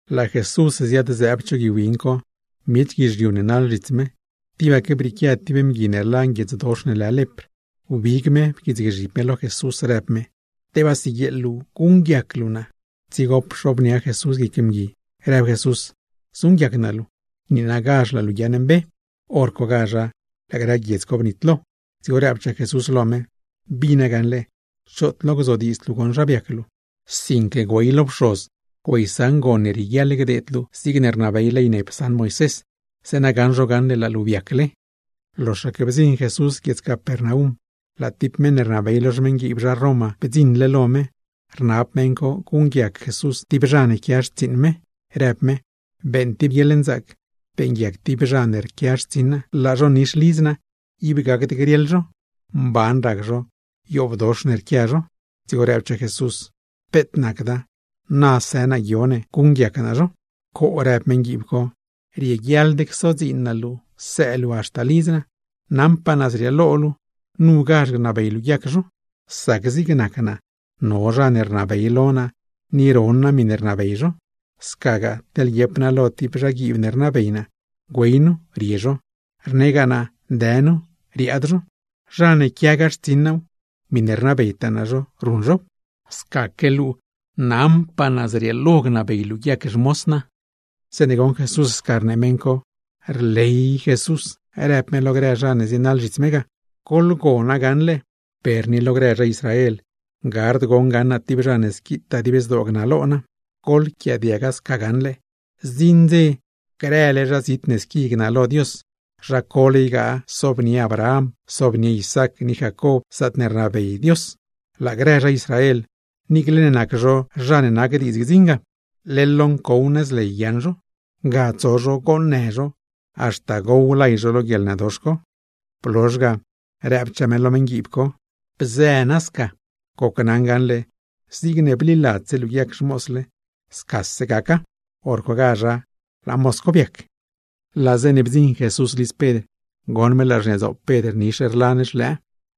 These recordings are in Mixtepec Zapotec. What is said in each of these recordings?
Laa Jesús ziad-zëëb cho gui win co, miech guizhiu ne naḻ zhits me, tibaque brieequia tib mgui ne rlan guiedzdox ne lë lepr, wbig me pquiitsgzhib me lo Jesús, rëb me: ―Tebaa siguieeḻ luu guṉguiac luu naa. Dzigo pxobnia Jesús guic mgui, rëb Jesús: ―Zuṉguiac naa luu. ¡Niinagazh laa luu guiaaṉmbe! Horcogazha laa grë guiedz co bnitlo. Dzigo rëbchaa Jesús lo me: ―Bina gaṉle, choot lo gzodiidzd luu goṉ zha biac luu; sinque güey lo pxoz güeysaṉ gon ne rieguiaḻ gdeed luu zigne rnabey ley ne psaṉ Moisés, zeeṉa gaṉ zho gaṉle laa luu biacle. Loxaque bdziṉ Jesús guiedz Capernaum, laa tib meṉ ne rnabey lo xmeṉguiib zha Roma bdziṉle lo me, rnab meṉ co guṉguiac Jesús tib zha ne quia xtsiiṉ me, rëb me: ―Beeṉ tib guieḻnzaac beeṉguiac tib zha ne rquia xtsiṉ naa, laa zho nix lidz naa ib gacd griaḻ zho, mban rac zho yoobdox ne rquia zho. Dzigo rëbchaa Jesús: ―Peet nacda, na së naa guio ne guṉguiac naa zho. ―Coo ―rëb meṉguiib co―, rieguiaḻd csodziin naa luu sëë luu haxta lidz naa. Naṉpaa naa zrieelo luu nugazh gnabey luu guiac zho. Sac zig nac naa no zha ne rnabey lo naa, ni ron naa miṉe rnabey zho; scagaa teḻ guiep naa tib lo zhaguiib ne rnabey naa: “Güey nu”, rie zho; rnegaa naa: “Dë nu”, riaad zho; zha ne ruṉgaa dziin lo naaw, miṉe rnabeytaa naa zho, ruṉ zhow. Scaque luu nagoṉ naṉpaa naa zrieelo sca gnabey luu guiac xmoz naa. Zeeṉe goṉ Jesús sca rnee meṉ co, rley me, rëb me lo grë zha ne zienaḻ zhits me ga: ―Lo grë zha Israel, gard goṉ gaṉ naa tib zha ne squitaa dib zdoo rnalo Dios. Ni goḻquiaadiaga gaṉle, zdziṉ dze grële zha zit ne squi gnalo Dios, zha co ygaa sobnie Abraham, sobnie Isaac ni Jacob zaatne rnabey Dios. Laa grë zha Israel, niicle nac zho zha ne nac diidz gdziṉ ga, leḻ lo ncow nëz ley guiaaṉ zho, ga tso zho goonnë zho, haxta gow lay zho lo guieḻnëdox co. Blozh ga rëbchaa me lo meṉguiib co: ―Bzë nasca, gocnaṉ gaṉle zigne bliladzse luu guiac xmoz luu, sca gaca. Horcogazha laa moz co biac. Laa zeeṉe bdziṉ Jesús lidz Pedr, goṉ me laa xniadzoop Pedr nix rlan xlëë.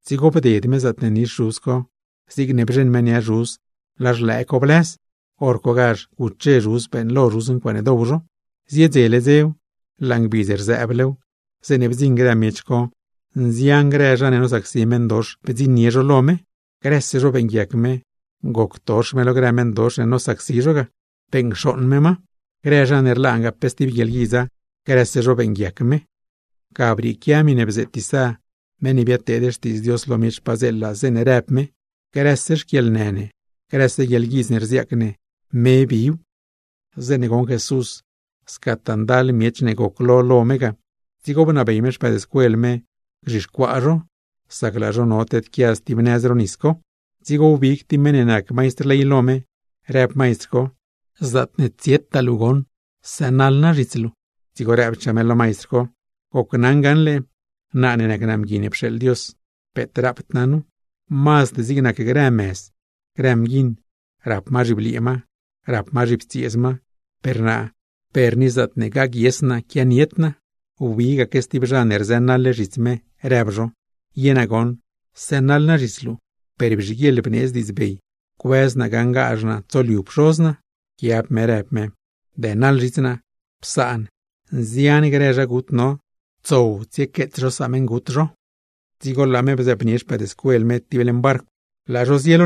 Dzigo bded me zaatne nix zhuz co, zigne bzheṉ me nia zhuz laa xlëë co blëz. Horcogazh guche zhuz beeṉlo zhuz ncuaaṉe dow zho. Ziedzele dzew, laa ngbidz rzëëblew, zeeṉe bdziṉ grë miech co, nzian grë zha ne nosacsi meṉdox bdziṉnie zho lo me. Grëse zho beeṉguiac me, goctox me lo grë meṉdox ne nosacsi zho ga, beṉcxooṉ me ma; ni zha ne rlangaa pe stib guieḻguidz, grëse zho beeṉguiac me. Ga brieequia miṉe bzeet Isá, meṉ ne biadteed xtiidz Dios lo miech padzeela, zeeṉe rëb me: “Grëse xquieḻnë ne, grëse guieḻguidz ne rziaac ne, me biw.” Zeeṉe goṉ Jesús scataa ndal miech ne goclo lo me ga, dzigo bnabey me xpëëdscuel me gzhixcuaa zho, sac laa zho no tedquia stib nëz ro nisdoo co. Dzigo wbig tib meṉ ne nac maistr ley lo me, rëb maistr co: ―Zaatne tsietaa luu goṉ, sënaḻ naa zhits luu. Dzigo rëbchaa me: ―Gocnaṉa gaṉle, naa ne nac naa Mgui ne pxeeḻ Dios, peet rapd naa nu, mazd zig nac grë mëz, grë mguiṉ, rap ma zhibliee ma, rap ma zhiptsieez ma; per naa per ni zaatne gaguies naa quianied naa. Wbigaque stib zha ne rzënaḻle zhits me, rëb zho: ―Ye naa goṉ sënaḻ naa zhits luu, per bzhiguieḻ bneedz diidzbey cuëz naa gaṉgazh naa tsoliu pxoz naa. Pquiab me rëb me: ―Dënaḻ zhits naa. Psaan, nzian grë zha gut no, tsow tsiequeets zho sameṉgut zho. Dzigo laa me bzëëbnie xpëëdscuel me tib leṉ barcw, laa zho zie.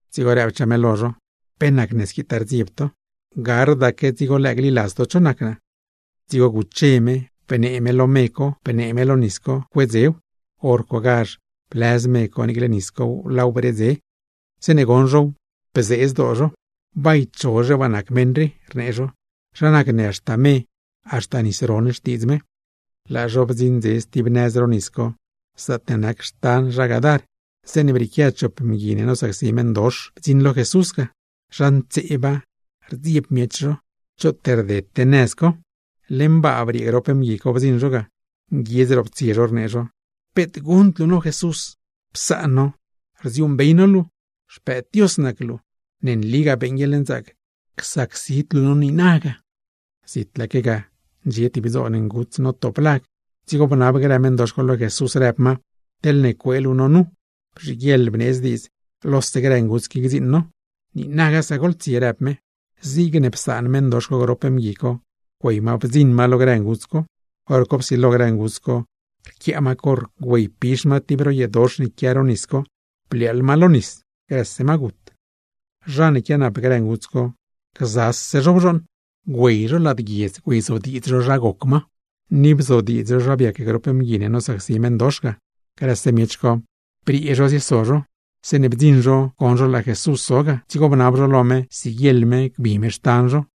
Dzigo rëbchaa me lo zho: ―¿Pe nacne squitaa rdzieb to? ¡Gardaque dzigo lëë gliladz to cho nac naa! Dzigo guche me, bnee me lo me co, bnee me lo nis co cuedzew. Horcogazha blëz me co, niicle nis cow laaw bredze. Zeeṉe goṉ zhow, bzee zdoo zho. ―Bay chozhe waa nac meṉ rii ―rnee zho―. ¿Zha nac ne haxta me, haxta nis ron xtiidz me? Laa zho bdziṉdze stib nëz ro nisdoo co, zaatne nac xtan zha Gadar, zeeṉe brieequia chop mgui ne nosacsi meṉdox, bdziṉ lo Jesús ga. Zha ntseeba, rdzieb miech zho, choot rdete nëz co. Leṉ baa briee grop mgui co bdziṉ zho ga, nguiedz roptsie zho rnee zho: ―¡Peet guṉd luu no Jesús, psaan no! Rdziuuṉbey no luu, Xpëëd Dios nac luu. Ne nligaa beeṉ guieḻnzaac csacsid luu no niinaga. Zitlaaque ga ndxie tib dzoon nguts notop lag, dzigo bnab grë meṉdox co lo Jesús rëb ma: ―Teḻne cuee luu no nu, bzhiguieḻ bneedz diidz lose grë nguts qui gdziiṉ no. ―Niinaga sca goḻtsie ―rëb me. Zigne psaan meṉdox co grop mgui co, güey ma bdziṉ ma lo grë nguts co. Horco psilo grë nguts co, rquiaa ma corr güeypix ma tib ro yeedox ne quia ro nisdoo co, bliaaḻ ma lo nis, grëse ma gut. Zha ne quianap grë nguts co, gzase zho bzhooṉ. Güey zho lad guiedz güeyzodiidz zho zha goc grë nguts co, ni bzodiidz zho zha biac grop mgui ne nosacsi meṉdox ga. Grëse miech co, briee zho zieso zho. Zeeṉe bdziṉ zho goṉ zho laa Jesús zo ga, dzigo bnab zho lo me siguieḻ me gbi me xtan zho.